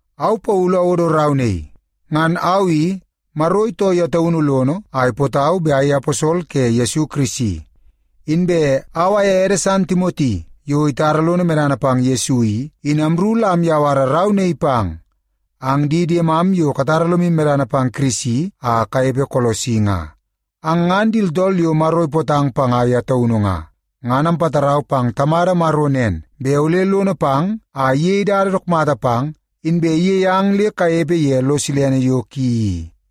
Au Paulu awodo rau naii. Ngan au i, Maro itoo ye taunu lono a ipootau bet ayei aposol ke Yesu Kirisi. Inbe au aye ede san Timoti, yo itara lono medana pang Yesu i, in amru la amyawara rau naii pang ang di diemam yo katara lomu medana pang Kirisi a kanepe Kolosi nga. Ang ngan di tooltool yo Maro ipootang panga ye taunu nga. Ngan ampatarau pang Tamada Maro nen, bet ole lono pang a iyei dada dook mata pang, inbe iyei ang le kanepe ye lo silene yo ki i.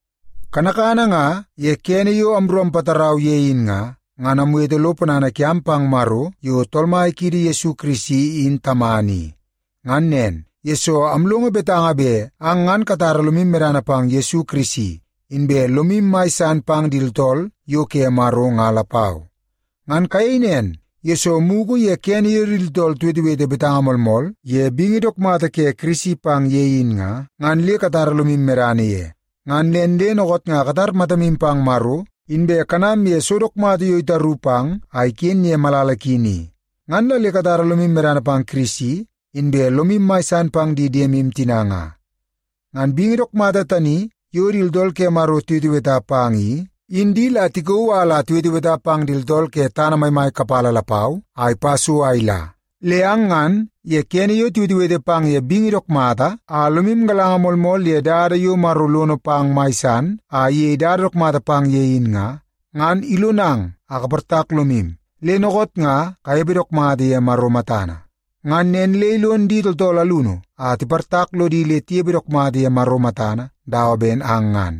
Kanakana nga ye kene yo amru ampatarau yang ye in nga, ngan amwete lo ponana kiam pang Maro yo Tool Mai kiidi Yesu Kirisi in Tamana i. Ngan nen, yesoo amlongo betanga bet ang ngan katara lomu medana pang Yesu Kirisi, inbe lomu mai san pang di tooltool yo ke Maro nga lapau. Ngan kayei nen, yesoo mugu ye kene yo di tooltool tiwetewete betanga moolmool ye bingi dook mata ke Kirisi pang ye in nga, ngan le katara lomu medana ye. Ngan nen le dookoot nga katar matamu pang Maro, inbe kanam ye so dook mata yo itaru pang a iken ye malala ki ni. Ngan la le katara lomu medana pang Kirisi, inbe lomu mai san pang di diemu tina nga. Ngan bingi dook mata tani yo di tooltool ke Maro tiweteweta pang i, in di la tikauu a la tiweteweta pang di tooltool ke tana maimai kapala lapau a ipa so a ila. Le ang ngan, ye kene yo tiwetewete pang ye bingi dook mata a lomu galanga moolmool ye dada yo Maro lono pang mai san a iyei dada dook mata pang ye in nga, ngan ilonang a kaportak lomu, le dookoot nga kanepe dook mata ye Maro matana. Ngan nen le ilon di tooltool alunu a tiportak lodi le tinepe dook mata ye Maro matana dawa ben ang ngan.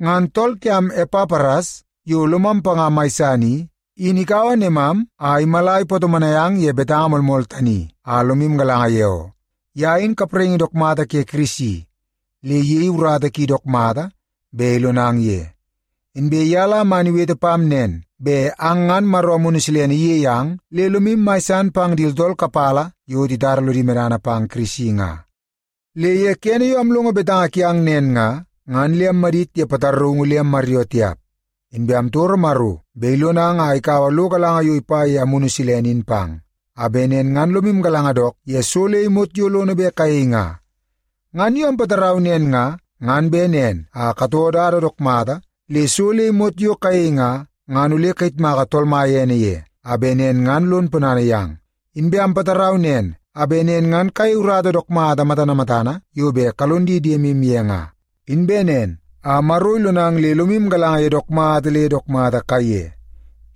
Ngan tool kiam, Epapras, yo lomam panga mai san i, in ikaua nemam a imala ipatomonai ang ye betanga moolmool tani a lomu galanga ye oo. Ye in kapraingi dook mata ke Kirisi le iyei urata ki dook mata bet ilonang ye. Inbe ye la man iwete pam nen, bet ang ngan Maro Amunu Silene iyei ang le lomu mai san pang di tooltool kapala yo titara lodi medana pang Kirisi nga. Le ye kene yo amlongo betanga kiang nen nga, ngan le ammadit ye pataraungu le ammaryoo tiap. Inbe amtoro Maro bet ilonang a ikaua lo galanga yo ipa ye Amunu Silene in pang, a bet nen ngan lomu galanga dook ye so le imot yo lono bet kayei nga. Ngan yo ampatarau nen nga, ngan bet nen a katoo dada dook mata, le so le imot yo kayei nga, ngan ole kayitmaka Tool Mai ene ye, a bet nen ngan lon ponana yang. Inbe ampatarau nen a bet nen ngan kayei urata dook mata matana matana yo bet kalon di diemu ye nga. Inbe nen a Maro ilonang le lomu galanga ye dook mata le dook mata kaiye.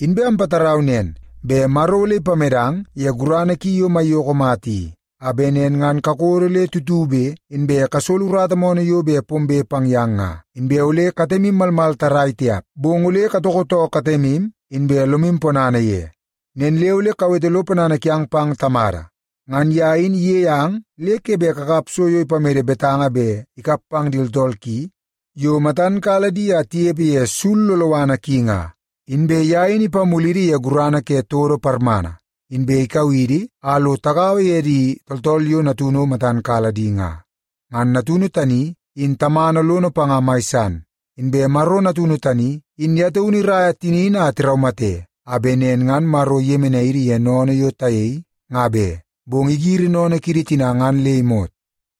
Inbe ampatarau nen, bet Maro ole ipamedang ye gurana ki yo maiyoko mata i, a bet nen ngan kakodo le tutube, inbe kasolo urata moonoo yo bet pombe pang yang nga, inbe ole katemu malmal tarrai tiap, bong ole katoko too katemu, inbe lomu ponana ye. Nen le ole kawete lo ponana kiang pang Tamada. Ngan ye in iyei ang le ke bet kakap so yo ipamede betanga bet ikap pang di tooltool ki yo matan kala di a tinepe ye sul loloana ki nga. Inbe ye in ipamulidi ye gurana ke todo parmana, inbe ikau idi a lo tagaua ye di tooltool yo Natunu matan kala di nga. Ngan Natunu tani in Tamana lono panga mai san. Inbe Maro Natunu tani in ye taunu iraia tinini a tiraumate, a bet nen ngan Maro iyemenai idi ye sennene yo tayei nga be, bong igiri sennene kiidi tina ngan le imot.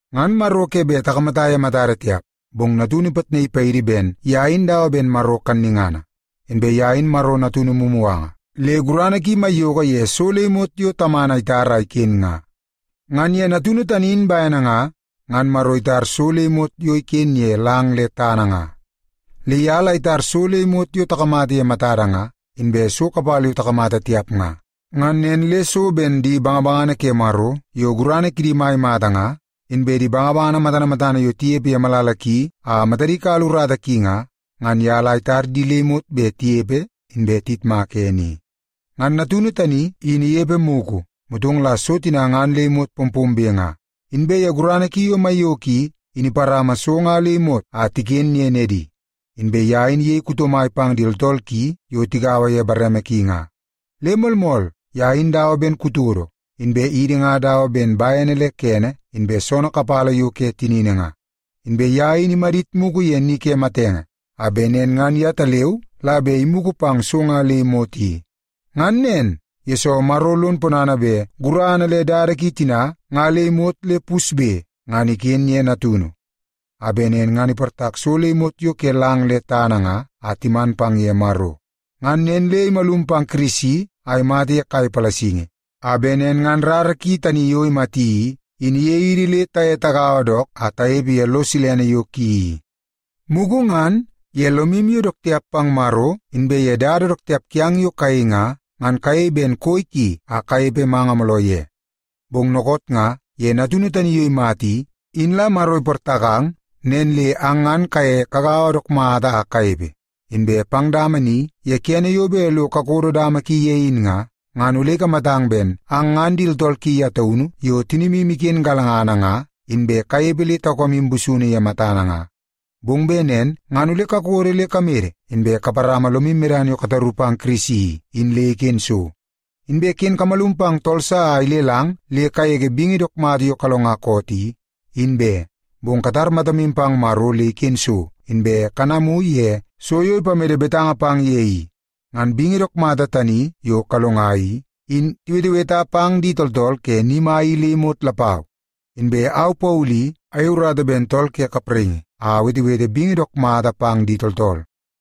Ngan Maro ke bet takamata ye matada tiap, bong Natunu ipitnaii paidi ben ye in dawa ben Maro kannungana. Inbe ye in Maro Natunu mumuganga, le gurana ki maiyoko ye so le imot yo Tamana itar a iken nga. Ngan ye Natunu tani in bene nga, ngan Maro itar so le imot yo iken ye lang le tana nga. Le ye la itar so le imot yo takamata ye matada nga, inbe so kapala yo takamata tiap nga. Ngan nen le so ben di bangabangana ke Maro yo gurana kidi mai mata nga, inbe di bangabangana matana matana yo tinepe ye malala ki a matadi kala urata ki nga, ngan ye la itar di le imot bet tinepe inbe tiyitmaka ene i. Ngan Natunu tani in inepe mugu, motong la so tina ngan le imot pompombe nga. Inbe ye gurana ki yo maiyoko i, in iparama so nga le imot a tiken ye nedi. Inbe ye in iyei kuto mai pang di tooltool ki yo tigaua ye bareme ki nga. Le moolmool, ye in dawa ben kutodo, inbe idi nga dawa ben bene le kene inbe soonoo kapala yo ke tinini nga. Inbe ye in imadit mugu ye ni ke matenge, a bet nen ngan yetaleu la bet imugu pang so nga le imot i. Ngan nen, yesoo Maro lon ponana bet gurana le dada ki tina nga le imot le pusbe, ngan iken ye Natunu, a bet nen ngan iportak so le imot yo ke lang le tana nga a timan pang ye Maro. Ngan nen le imalum pang Kirisi a imata ye kai palasingi, a bet nen ngan rara ki tani yo imati i, in iyei idi le taye tagaua dook a tanepe ye lo silene yo ki i. Mugu ngan, ye lomu yo dook tiap pang Maro, inbe ye dada dook tiap kiang yo kayei nga, ngan kayei ben koi ki a kanepe manga mooloo ye. Bong dookoot nga ye Natunu tani yo imata i, in la Maro iportakang, nen le ang ngan kaye kagaua dook mata a kanepe. Inbe pang dama ni ye kene yo bet lo kakodo dama ki ye in nga, ngan ole ikamatang ben ang ngan di tooltool ki ye taunu yo tinimu iken galangana nga, inbe kanepe le taukamu busunu ye matana nga. Bong bet nen ngan ole kakodo le kamede, inbe kaparama lomu medana yo kataru pang Kirisi i, in le iken so. Inbe ken kamalum pang tool sa a ilelang le kagege bingi dook mata yo kalonga koot i, in be, bong katar matamu pang Maro le iken so, inbe kanamu ye so yo ipamede betanga pang ye i. Ngan bingi dook mata tani yo kalonga i, in tiweteweta pang di tooltool ke ni mai i le imot lapau. Inbe au Paulu i, ayei urata ben tool ke kapraingi a awetewete bingi dook mata pang di tooltool.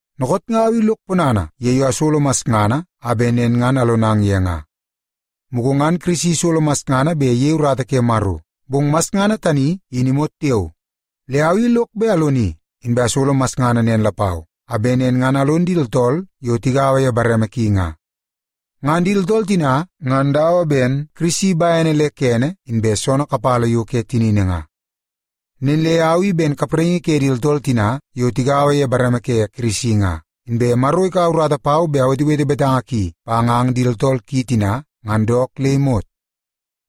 Dookoot nga au i lok ponana ye yo asolo masngana a bet nen ngan alonang ye nga. Mugu ngan Kirisi isolo masngana bet iyei urata ke Maro, bong masngana tani in imot tiao. Le au i lok bet aloni, inbe asolo masngana nen lapau, a bet nen ngan alon di tooltool yo tigaua ye bareme ki nga. Ngan di tooltool tina, ngan dawa ben Kirisi bene le kene inbe soonoo kapala yo ke tinini nga. Nen le au i ben kapraingi ke di tooltool tina yo tigaua ye bareme ke Kirisi nga, inbe Maro ikaua urata pau bet awetewete betanga ki pang ang di tooltool ki tina, ngan dook le imot.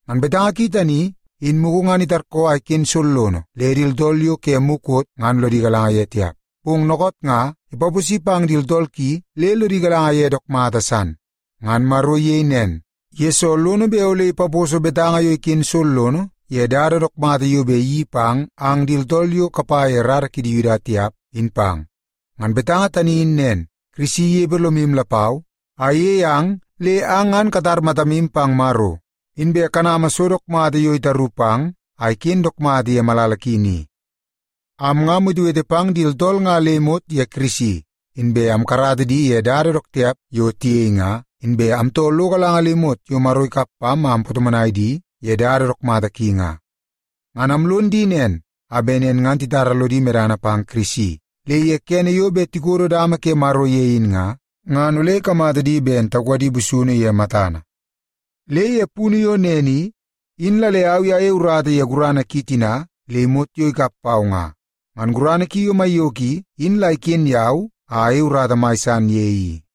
Ngan betanga ki tani, in mugu ngan itarkoo a iken sollono le di tooltool yo ke mukot ngan lodi galanga ye tiap, bong dookoot nga ipaposi pang di tooltool ki le lodi galanga ye dook mata san. Ngan Maro iyei nen, yesoo lono bet ole ipaposo betanga yo iken sollono ye dada dook mata yo bet iyeii pang ang di tooltool yo kapa ye rara kidi Yuda tiap, in pang. Ngan betanga tani in nen, Kirisi inepe lomu lapau a iyei ang le ang ngan katar matamu pang Maro, inbe kanama so dook mata yo itaru pang a iken dook mata ye malala ki ni. Am nga amwetewete pang di tooltool nga le imot ye Kirisi, inbe amkarata di ye dada dook tiap yo tiyei nga, inbe amtoo lo galanga le imot yo Maro ikap pam a ampatomonai di ye dada dook mata ki nga. Ngan amlon di nen a bet nen ngan titara lodi medana pang Kirisi, le ye kene yo bet tikodo dama ke Maro ye in nga, ngan ole ikamata di ben taukadi busunu ye matana. Le ye punu yo nen i, in la le au i ayei urata ye gurana ki tina le imot yo ikap pau nga. Ngan gurana ki yo maiyoko i, in la iken yau a ayei urata mai san ye i.